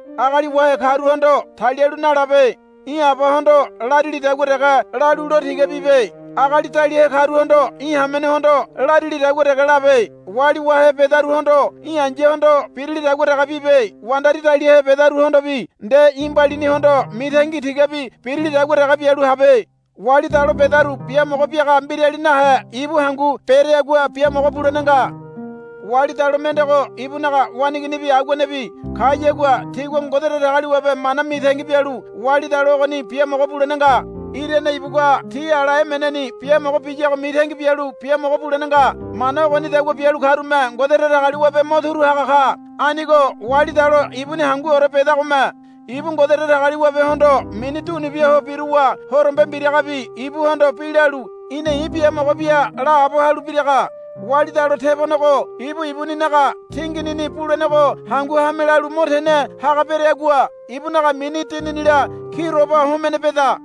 Agali wahe karuhondo talialu nalabe. Í̠ abahondo larilidagua dege lalu lo tiga bibe. Agali daliahe karuhondo í̠ hamenehondo larilidagua dege labe. Wali wahe bedaruhondo í̠ ai̱yahondo birilidagua dege bibe. Wandari daliahe bedaruhondobi nde í̠ mbalinihondo mitangi tigabi birilidagua dege bialu habe. Wali dalo bedaru biamogo biaga mbirali nahe ibu hangu bereagua biamogo bulene nga. Wali dalo mendego ibunaga waneiginibi aguanebi kayagua tigua Ngode Datagaliwabe mana mitangi bialu wali dalo ogoni biamogo bulene nga. Irane ibugua ti ala emeneni biamogo biyago mitangi bialu biamogo bulene nga. Mana ogonidagua bialu karume Ngode Datagaliwabe mo turu haga ka. Anigo wali dalo ibuni hanguore bedagome ibu Ngode Datagaliwabehondo mini dunubia ho biruwa horombe mbiragabi ibuhondo bi lalu, Í̠na i̱ biamogo bia, laabo halu biraga. Wali dalo tebonego ibu ibuninaga tinginini bulenego hangu hame lalu mo tene haga bereagua ibunaga mini dininila kiroba homene beda.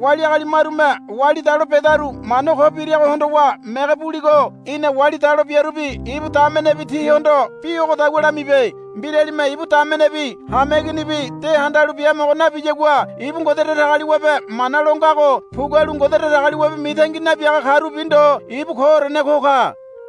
Wali agali marume wali dalo bedaru mana ko birago hondowa mege buligo í̠na wali dalo biarubi ibu damenebi tihondo bi ogodagua lamibe. Mbiralime ibu damenebi hameiginibi de handalu biamogo nabiyagua ibu Ngode Datagaliwabe mana lo ngago pugualu Ngode Datagaliwabe mitangi nabiaga karubi ndo ibu koorene ko ka.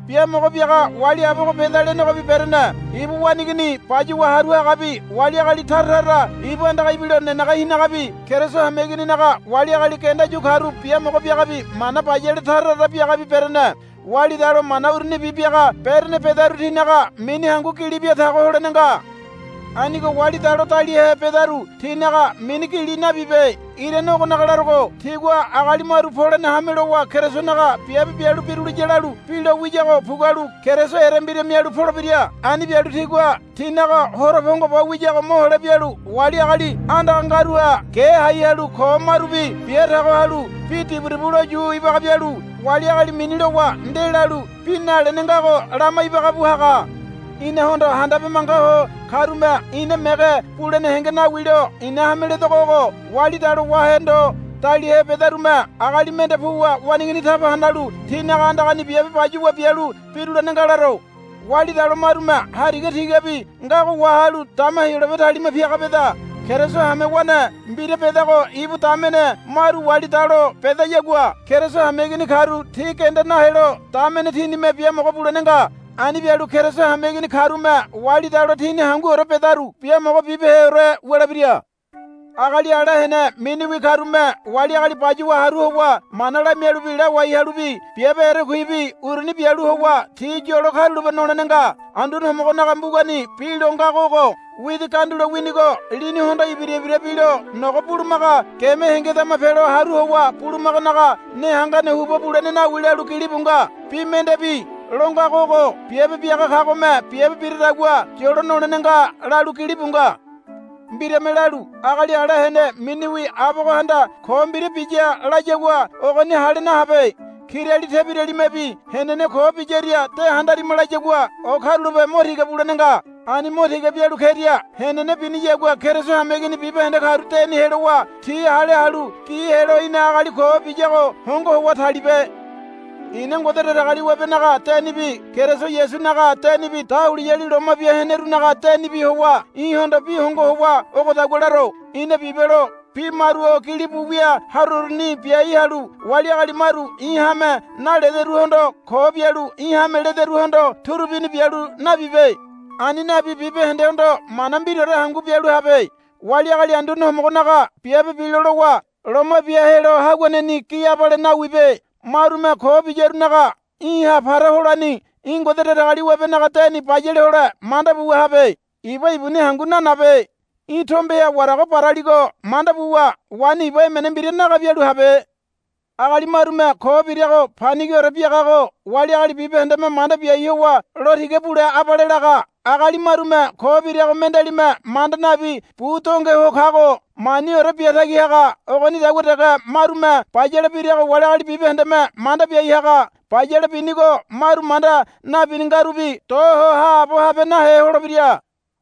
biamogo biaga wali abogo beda lenegobi berene. Ibu waneigini bayuwa haru hagabi wali agali tara tara ibu andaga ibilo nenege hinagabi Keriso hameigininaga wali agali genda yu karu biamogo biagabi mana bayale tara tara biagabi berene. Wali dalo mana urunibi biaga berene bedaru tinaga mini hangu gili biatago holene nga. Anigo wali dalo daliahe bedaru tinaga mini gili nabibe. Irane ogonaga larogo tigua agali maru polene hame lowa Kerisonaga biabe bialu biruliya lalu bi lowiyago pugualu Keriso erembira mialu polebira. Ani bialu tigua tinaga horo pongo bo wiyago mohole bialu wali agali andaga ngaruha ge hai halu ko marubi bia tago halu bi diburibu loyu ibaga bialu wali agali mini lowa ndelalu bi nalene ngago lama ibaga bu haga. Inahondo handabe manga ho karume ina mege bulene henge nawilo i̱na hame ledogo ogo. Wali dalo wahe ndo daliahe bedarume agali mende puwa waneigini taba hanalu tinaga andagani biabe bayuwa bialu birulene nga laro. Wali dalo marume hariga tigabi ngago wahalu dama Heyolabe talima piaga beda. Keriso hamewane mbira bedago ibu damene maru wali dalo bedayagua Keriso hameigini karu ti genda nahelo damene tinime biamogo bulene nga. Ani bialu Keriso hameigini karume wali dalo tini hanguore bedaru biamogo bibeheore wulebira. Agali ala hene miniwi karume wali agali bayuwa haru howa mana lamialubi lawai halubi biabe erekuibi uruni bialu howa ti yolo karulape nolene nga. Anduane Homogonaga mbugani bi lo ngago ogo, Widi gandulo winigo lini hondo ibira ibira bilo nogo bulumaga geme hengedama pelo haru howa bulumaganaga ne hangane huba bulene nawi, lalu gilibu nga. Bi mendebi lo ngago ogo. Biabe biaga kagome biabe biradagua yolo nolene nga, lalu gilibu nga. Mbirame lalu, Agali ala hene miniwi abogohanda ko mbira biya, layagua ogoni hale nahabe. Kirali tebiralimebi, Henene ko biyaria de handarima, layagua o karulape mo tiga bulene nga. Ani mo tiga bialu keria henene biniyagua Keriso hameigini bibahende karu deni helowa ti hale halu gi helo í̠na agali ko biyago hongo howa talibe. I̱na Ngode Datagaliwabenaga denibi Keriso Yasunaga denibi dahuliyali loma bia henerunaga denibi howa í̠hondo bi hongo howa ogodagua laro. Í̠na bibelo bi maru o gilibu wia haroruni biai halu wali agali maru í̠ hame nalederuhondo ko bialu í̠ hame lederuhondo turubini bialu nabibe. Ani nabi bibahendehondo mana mbiraore hangu bialu habe. Wali agali Anduane Homogonaga biabe bilo lowa loma bia helo haguaneni gi abale nawibe. Marume ko biyarunaga í̠ha para holani í̠ Ngode Datagaliwabenaga deni bayale hole manda buwa habe. Iba ibuni hangu nanabe. Í̠ tombeha warago baraligo manda buwa waini iba emene mbira naga bialu habe. Agali marume ko birago panigiore biagago wali agali bibahendeme manda biai howa lo tiga bule abale laga. Agali marume ko birago mendealime manda nabi bu donge ho kago maniore bia tagi haga. Ogonidagua dege marume bayale birago wali agali bibahendeme manda biai haga. Bayale binigo maru manda nabini ngarubi do ho haabo habe nahe holebira.